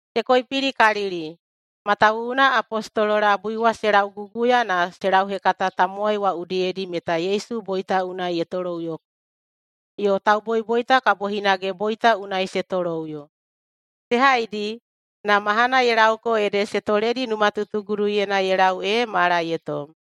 Se koipilikalili matawuwuna apostolo labui wa se lauguguya na se lauhekata tamowai wa udiyedi meta Yesu boita unai ye toloꞌuyoko, yo tauboiboita kabo hinage boita unai se toloꞌuyo. Se haidi, na mahana ye laoko ede se toledi numatutuguduyena ye lau ee mala ye tom.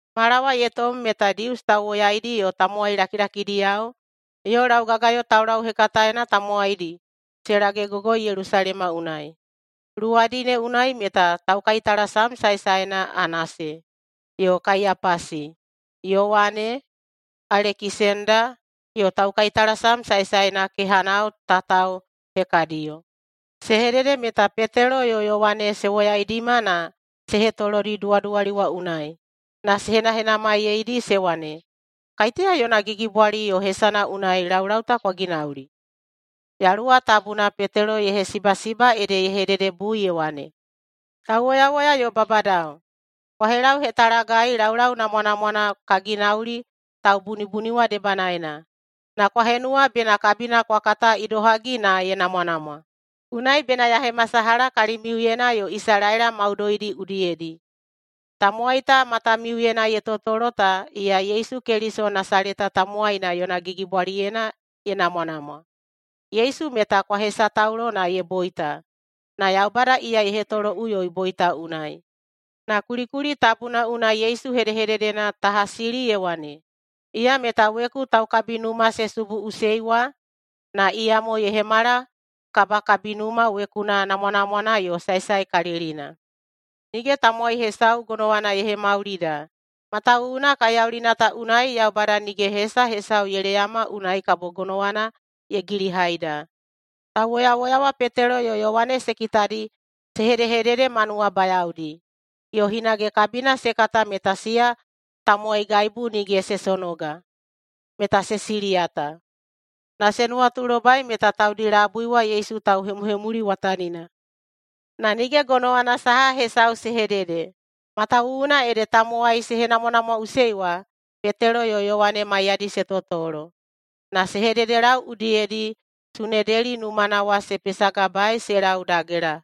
Mala wa ye tom meta Dius tauwoyaidi yo tamowai lakilakidiyao yo laugagayo taulauhekataena tamowaidi se lagegogoi Yelusalema unai. Luwadi ne unai meta taukaitalasam saesaena Anase, yo Kaiyapasi, Yowane, Alekisenda yo taukaitalasam saesaena kehanao tatao hekadiyo. Se hedede meta Petelo yo Yowane se woyaidima na se hetolodi duwaduwali wa unai, na se henahenamaiyeidi se wane, “Kaiteya yona gigibwali yo hesana unai laulau ta kwa ginauli?” Yaluwa Tabuna Petelo ye hesibasiba ede ye hededebui ye wane, “Tauwoyawoya yo babadao! Kwa helauhetalagai laulau namwanamwana ka ginauli taubunibuni wa debanaena. Na kwa henuwa bena kabina kwa kata idohagi na ye namwanamwa. Unai bena ya hemasalaha kalimiuyena yo Isalaela maudoidi udiyedi: Tamowai ta matamiuyena ye totolo ta, iya Yesu Keliso Nasaleta tamowaina yona gigibwaliyena ye namwanamwa. Yesu meta kwa hesataulo na ye boita, na Yaubada iya ye hetoloꞌuyoi boita unai. Na kulikuli tabuna unai Yesu hedehededena ta hasili ye wane, ‘Iya meta weku taukabinuma se subuꞌusei wa, na iyamo ye hemala kabakabinuma wekuna namwanamwana yo saesaekalilina.’ Nige tamowai hesau gonowana ye hemaulida, matawuwuna kaiyaulina ta unai Yaubada nige hesa hesau ye leyama unai kabo gonowana ye gilihaida.” Tauwoyawoya wa Petelo yo Yowane se kitadi se hedehedede ma nuwabayaodi, yo hinage kabina se kata meta siya tamowaigaibu nige se sonoga, meta se siliyata. Na se nuwatulobai meta taudi labui wa Yesu tauhemuhemuliwatanina. Na nige gonowana saha hesau se hedede, matawuwuna ede tamowai se henamwanamwaꞌusei wa Petelo yo Yowane maiyadi se totolo. Na se hededelau udiyedi Sunedeli numana wa se pesagabaei se lau dagela,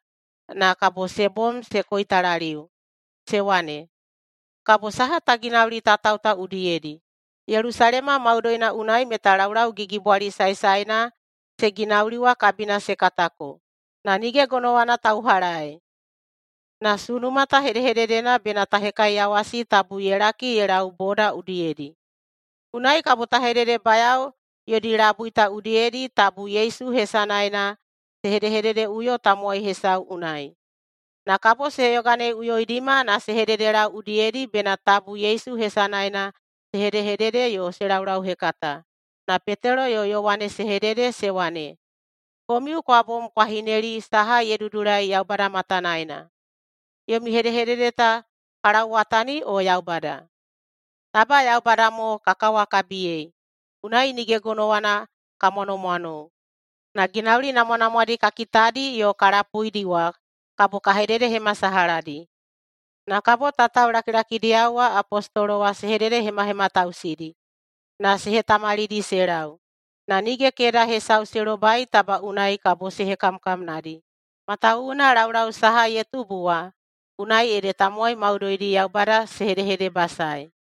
na kabo se bom se koitalaliu se wane, “Kabo saha ta ginauli tatao ta udiyedi? Yelusalema maudoina unai meta laulaugigibwali saesaena se ginauli wa kabina se katako, na nige gonowana ta uhalaei. Na sunuma ta hedehededena bena ta hekaiyawasi tabu ye laki ye lau boda udiyedi. Unai kabo ta hededebayao yodi labui ta udiyedi tabu Yesu hesanaena se hedehededeꞌuyo tamowai hesau unai.” Na kabo se yoganeiꞌuyoidima na se hededelau udiyedi bena tabu Yesu hesanaena se hedehedede yo se laulauhekata. Na Petelo yo Yowane se hedede se wane, “Komiu kwa bom kwa hineli saha ye dudulai Yaubada matanaena, yomi hedehedede ta ka lauwatani o Yaubada? [Taba Yaubada mo ka kawakabiyei!] Unai nige gonowana ka mwanomwanou, na ginauli namwanamwadi ka kitadi yo ka lapuidi wa kabo ka hededehemasalahadi.” Na kabo tatao lakilakidiyao wa apostolo wa se hededehemahematausidi na se hetamalidi se lau. Na nige keda hesau se lobai taba unai kabo se hekamkamnadi, matawuwuna laulau saha ye tubu wa unai ede tamowai maudoidi Yaubada se hedehedebasaei.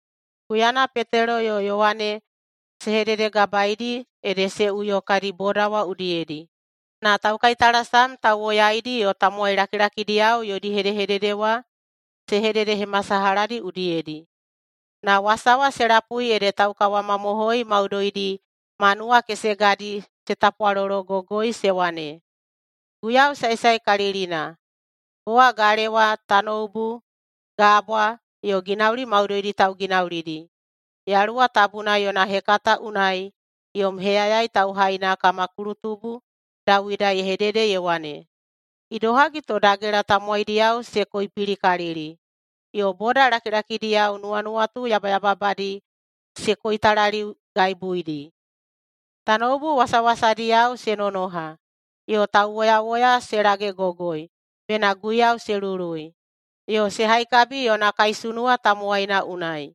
Huyana Petelo yo Yowane se hededegabaedi ede se uyo kadi boda wa udiyedi, na taukaitalasam tauwoyaidi yo tamowai lakilakidiyao yodi hedehedede wa se hededehemasalahadi udiyedi. Na wasa wa se lapui ede taukawamamohoi maudoidi ma nuwakesegadi se tapwalologogoi se wane, “Guiyau saesaekalilina, kowa galewa, tanoubu, gabwa, yo ginauli maudoidi tauginaulidi. Yaluwa Tabuna yona hekata unai yom heyayai tauhaina kama kulutubu Dawida ye hedede ye wane, ‘Idohagi to dagela tamowaidiyao se koipilikalili, yo boda lakilakidiyao nuwanuwatu yabayababadi se koitalaliugaibuidi? Tanoubu wasawasadiyao se nonoha, yo tauwoyawoya se lagegogoi bena Guiyau se lului yo se haikabi yona kaisunuwa tamowaina unai.’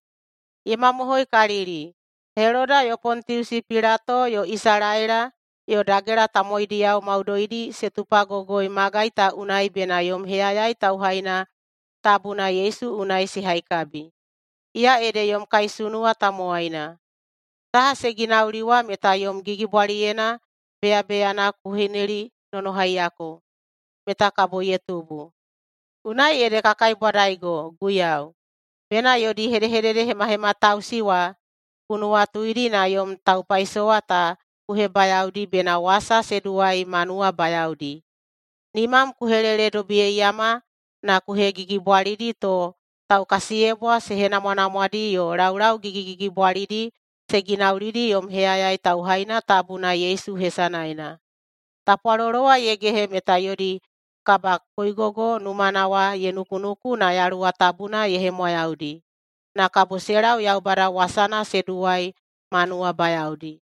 Ye mamohoikalili, Heloda yo Pontiusi Pilato yo Isalaela yo dagela tamowaidiyao maudoidi se tupagogoi magai ta unai bena yom heyayai tauhaina tabuna Yesu unai se haikabi. Iya ede yom kaisunuwa tamowaina. Saha se ginauli wa meta yom gigibwaliyena beyabeyana ku hinelinonohaiyako meta kabo ye tubu. Unai ede ka kaibwadaigo, Guiyau, bena yodi hedehededehemahematausi wa ku nuwatuidi na yom taupaisowa ta ku hebayaodi bena wasam se duwai ma nuwabayaodi. Nimam ku heleledobiyeiyama na ku hegigibwalidi to taukasiyebwa se henamwanamwadi yo laulau gigigigibwalidi se ginaulidi yom heyayai tauhaina tabuna Yesu hesanaena.” Tapwalolo wa ye gehe meta yodi kabakoigogo numana wa ye nukunuku na Yaluwa Tabuna ye hemwayaudi, na kabo se lau Yaubada wasana se duwai ma nuwabayaodi.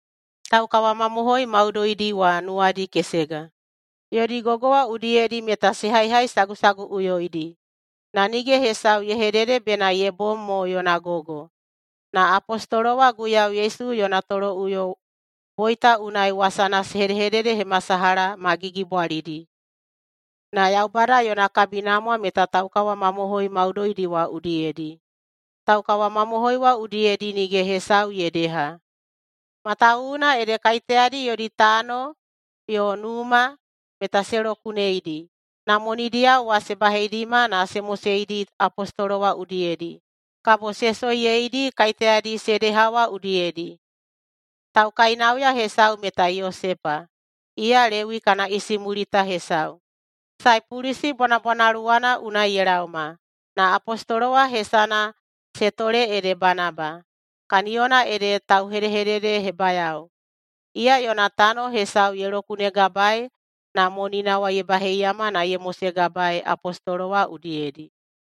Taukawamamohoi maudoidi wa nuwadi kesega. Yodi gogo wa udiyedi meta se haihaisagusaguꞌuyoidi, na nige hesau ye hedede bena ye bom mo yona gogo. Na apostolo wa Guiyau Yesu yona toloꞌuyo boita unai wasana se hedehededehemasalaha ma gigibwalidi. Na Yaubada yona kabinamwa meta taukawamamohoi maudoidi wa udiyedi. Taukawamamohoi wa udiyedi nige hesau ye deha, matawuwuna ede kaiteyadi yodi tano yo numa, meta se lokuneidi na monidiyao wa se baheidima na se moseidi apostolo wa udiyedi, kabo se soiyeidi kaiteyadi se deha wa udiyedi. Taukainauya hesau meta Yosepa. Iya Lewi kana isimulita hesau, Saipulusi bwanabwanaluwana unai ye laoma. Na apostolo wa hesana se tole ede Banaba, kaniyona ede tauhedehededehebayao. Iya yona tano hesau ye lokunegabaei na monina wa ye baheiyama na ye mosegabaei apostolo wa udiyedi.